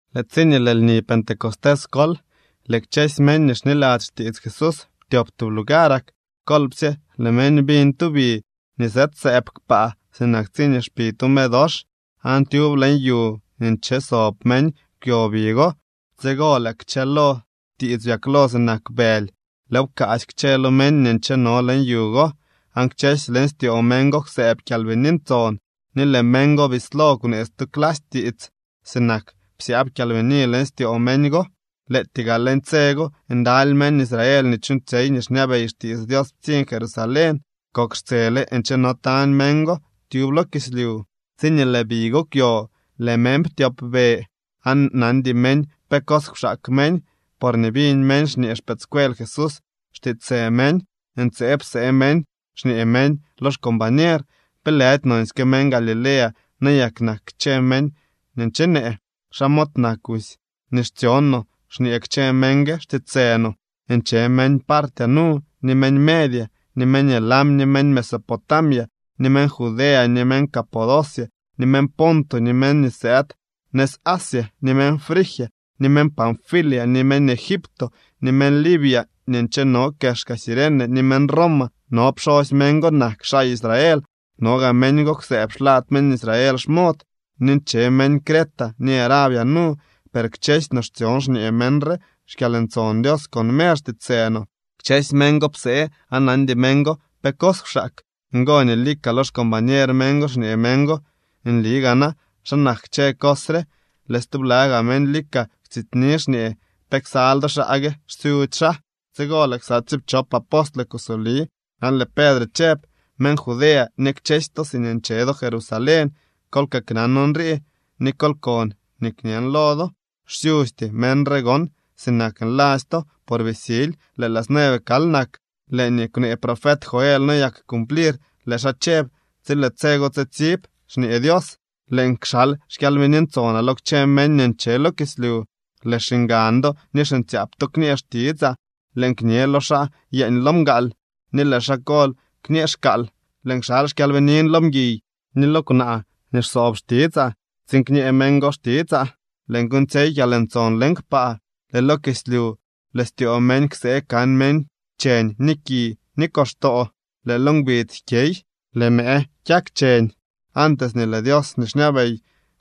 Lëë tsiñee lëë lni Pentecostés kol, lëë kchësy meñ nii xniladzy xtiits Jesús ptyop tub lugarak. Kolpsye lëë meñ biñ tu bi nii sëëdsëëb kpaa, sinak tsiñee xpi tu medox, aan tyub leñ yu nii nche sob meñ kwyo bi go. Tsigo lëë kchëlo tiits byaklo sinak bëly, lëëw pkaasy kchë lo meñ nii ncheno leñ yu go. Aan kchësy leñ styoo meñ go kwsëëb Kyalbini Ntson, ni lëë meñ go bislo kwnee stu clasy tiits, sinak nii psyaab Kyalbini leñ styoo meñ go. Lëëtyee gaa leñ tse go ndaly meñ Israel nii chuuñtsyey nii xñabey xtiits Dios ptsiñ Jerusalén, kok xtsele ncheno tañ meñ go tyub lo kislyu. Tsiñee lëë bi go kwyo, lëë meñ ptyopbe, aan nandy meñ pe cos kwxaak meñ, porñee biñ meñ xñee xpëëdscuel Jesús xtiitsë meñ. Ntseeb psee meñ, xñee meñ lo xcombañer: —¿Pe lëdy nonsyke meñ Galilea nayak nak kchë meñ nii nchenee? ¿Xa mod nak busy, nii xtsyon no xñee kchë meñ gue xtiitsë no? Nche meñ Partia nu, ni meñ Media, ni meñ Elam, ni meñ Mesopotamia, ni meñ Judea, ni meñ Capodocia, ni meñ Ponto, ni meñ nii sëëd nëz Asia, ni meñ Frigia, ni meñ Panfilia, ni meñ Egipto, ni meñ Libia nii ncheno kexka Cirene, ni meñ Roma. No pxosy meñ go nak xaa Israel, no gaa meñ go kwsëëb xlad meñ Israel xmod. Ni nche meñ Creta ni Arabia nu. Per kchësy no xtsyon xñee meñ re xkyalntson Dios con mer xtiitsë no. Kchësy meñ go psee aan nandy meñ go pe cos kwxaak. Ngo nii lika lo xcombañer meñ go xñee meñ go: —Nli gaa na ¿xa nak kchë cos re? Lëë stubla gaa meñ lika kwtsityni, xñee: —¿Pe ksal do xaa gue?, xsyudzy xaa. Tsigo lëë ksa tsiipchop apostle kusoli aan lëë Pedre chëb: —Meñ Judea ni kchësy to siñee ncheno do Jerusalén, kol kaknan nrii, ni kol kon nii kñen lo do. Xsyusty meñ re gon sinak nladzy to, por bii sily, lëë las nueve kal nak. Lëë nii kwnee profet Joel noyak cumplir. Lëë xaa chëb: Tsi lëë tse go tsitsib, xñee Dios, lëën kxal xKyalbini Ntsonaa lo kchë meñ nii nche lo kislyu. Lëë xiñgan do ni xiñtsyaap to kñee xtitsaa, lëën kñe lo xaa yeeñ lo mgaal, ni lëë xaa kol kñee xkaal. Lëën kxal xKyaalbiniin lo mguiy ni lo kwnaa nii xsoob xtitsaa, tsiin kñee meñ go xtitsaa. Lëën kuuñtsyey kyalntson leñ kpaa, lëë lo kislyu lëë styoo meñ ksee kan meñ cheñ ni ki ni koxtoo. Lëë lo ngbidz jkyey, lëë mëë kyak cheñ, antes nii lëë Dios nii xñabey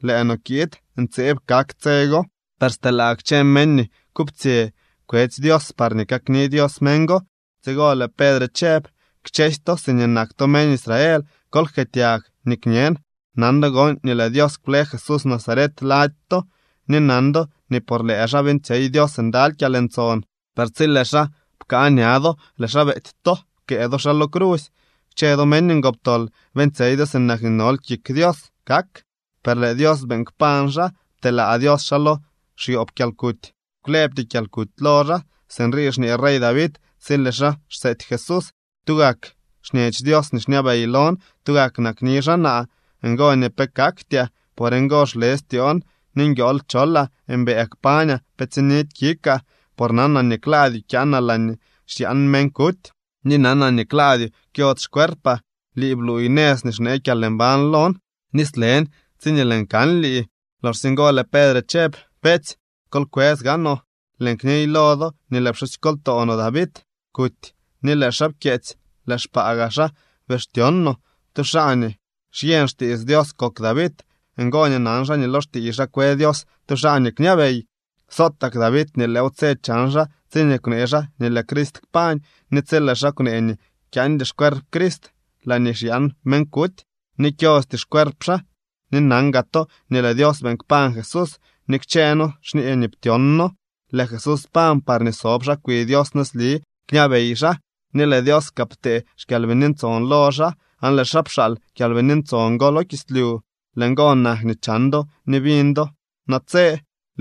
lëë no kiid. Ntseeb kak tse go. Per stelaa kchë meñ nii kuptsyë kwetsy Dios parñee kakni Dios meñ go. Tsigo lëë Pedre chëb: —Kchësy to siñee nak to meñ Israel, kol jkëëtyag nii kñen. Nan do gon nii lëë Dios kwle Jesús Nazaret lady to, ni nan do nii por lëë xaa beeñtsyey Dios ndaly kyalntson. Per tsi lëë xaa pkaa ña do, lëë xaa beety to, pkëë do xaa lo crusy. Kchë do meñ ngoptol, beeñtsyey do sinak nii nol kik Dios kak. Per lëë Dios beeñ kpañ xaa, pteelaa Dios xaa lo xyoob kyalkuty, kwlëbty kyalkuty lo xaa. Sinrii xñee rey David tsi lëë xaa xseety Jesús: Tugak xñech Dios nii xñabey lon, tugak nakni xaa naa, ngo nii pe kaktyaa. Por ngo xle styoon, ni nguiool cholaa. Mbëë kpañaa, pe tsinidy kikaa, por nanaa nii klaadyoo kyaanaa laañee xyaan meñ kuty, ni nanaa nii klaadyoo kyodz xcuerpaa. Lii bluuy nëz nii xnee kyalmbañ lon, ni slen tsiñee lëën kan lii. Loxsye ngo lëë Pedre chëb: —Beetsy, kol kwës gaanoo, lëën kniy lo do nii lëë pxusykoltoo no David kuty, ni lëë xaa pkyeetsy, lëë xpaa gaa xaa bii xtyon no. Tu xaa nii xyeñ xtiits Dios kok David. Ngo nii nan xaa nii lo xtiiy xaa kwe Dios tu xaa nii kñabey. Sotak David nii lëëw tse chan xaa tsiñee kwnee xaa nii lëë Crist kpañ, ni tsi lëë xaa kwnee nii kyaandy xcuerp Crist laañee xyaan meñ kuty ni kyosty xcuerp xaa. Ni nan gaa to nii lëë Dios beeñ kpañ Jesús, ni kchëë noo xñee nii ptyon noo. Lëë Jesús pañ parñee sob xaa kwi Dios nëzli, kñabey xaa. Ni lëë Dios kaa ptee xKyalbini Ntson lo xaa, aan lëë xaa pxaal Kyalbini Ntson go lo kislyu. Lëë ngo nak nii chan do ni biñ do natse.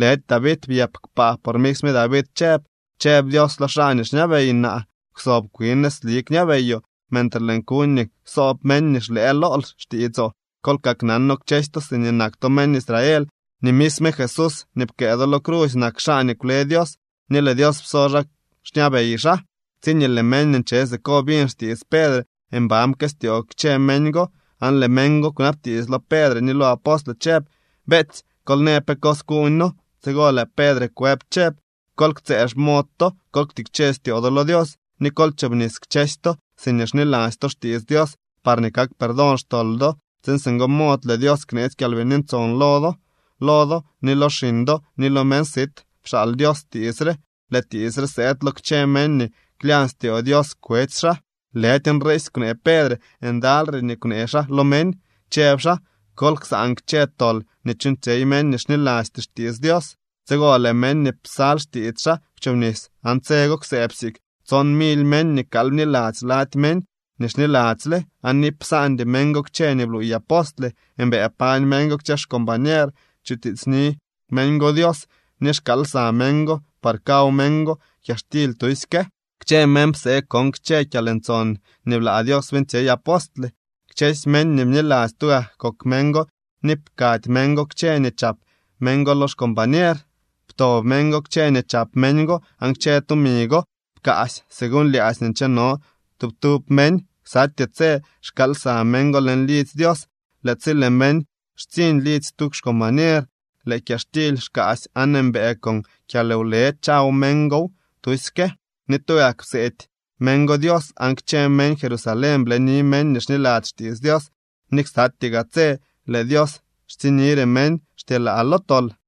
Lëdy David byëp kpaa, por misme David chëb: Chëb Dios lo xaa nii xñabey naa: “Kwsob kwin nëzli kñabeyoo, mentre lëën kuñ nii ksoob meñ nii xlëë lool xtiitsoo.” ’Kol kaknano kchësy to siñee nak to meñ Israel nii misme Jesús nii pkëë do lo crusy nak xaa nii kwle Dios, ni lëë Dios pso xaa xñabey xaa. Tsiñee lëë meñ nii nche siko biñ xtiits Pedre, mban pteestyoo kchë meñ go, aan lëë meñ go kwnabtiits lo Pedre ni lo apostle chëb: —Beetsy, kol në pe cos kuuñ noo. Tsigo lëë Pedre kwëb chëb: —Kol ktsëë xmod to, kol ktikche styoo do lo Dios, ni kol chobnis kchësy to siñee xniladzy to xtiits Dios parñee kak perdón xtol do, tsiin singo mod lëë Dios kneetsy Kyalbini Ntson lo do. Lo do ni lo xiñ do ni lo meñ sit pxaal Dios tiits re. Lëë tiits re sëëd lo kchë meñ nii klyañ styoo Dios kwetsy xaa. Lëdy nriisy kwnee Pedre, ndalyre nii kwnee xaa lo meñ, chëb xaa: —Kol ksaan kchë tol nii chuuñtsyey meñ nii xnilasty xtiits Dios. Tsigo lëë meñ nii psal xtiits xaa kwchobnis, aan tse go kwsëëb siik tson mily meñ nii kal bniladzy lady meñ nii xniladzyle. Aan iip psaandy meñ go kchë nii bluuy apostle, mbëë pañ meñ go kchë xcombañer, chutiitsni meñ go Dios ni xkaal lsa meñ go par kaw meñ go kyaxtily tusyke. Kchë meñ psee kon kchë kyalntson nii blaa Dios beeñtsyey apostle. Kchësy meñ nii bniladzy tugak kok meñ go ni pkady meñ go kchë nii chap meñ go lo xcombañer. Pto meñ go kchë nii chap meñ go, aan kchë tumi go pkaasy según lyaadzy nii ncheno tub tub meñ. Ksatyee tse xkaal lsa meñ go leñ lidzy Dios. Lëë tsi lëë meñ xtsiñ lidzy tu xcombañer, lëë kyaxtily xkaasy aan mbëë con kyalwle chaw meñ gow tusyke. Ni tugak pseety meñ go Dios aan kchë meñ Jerusalén bleni meñ nii xniladzy xtiits Dios ni ksatyee gaa tse lëë Dios xtsiñnire meñ xtyelaa lo tol.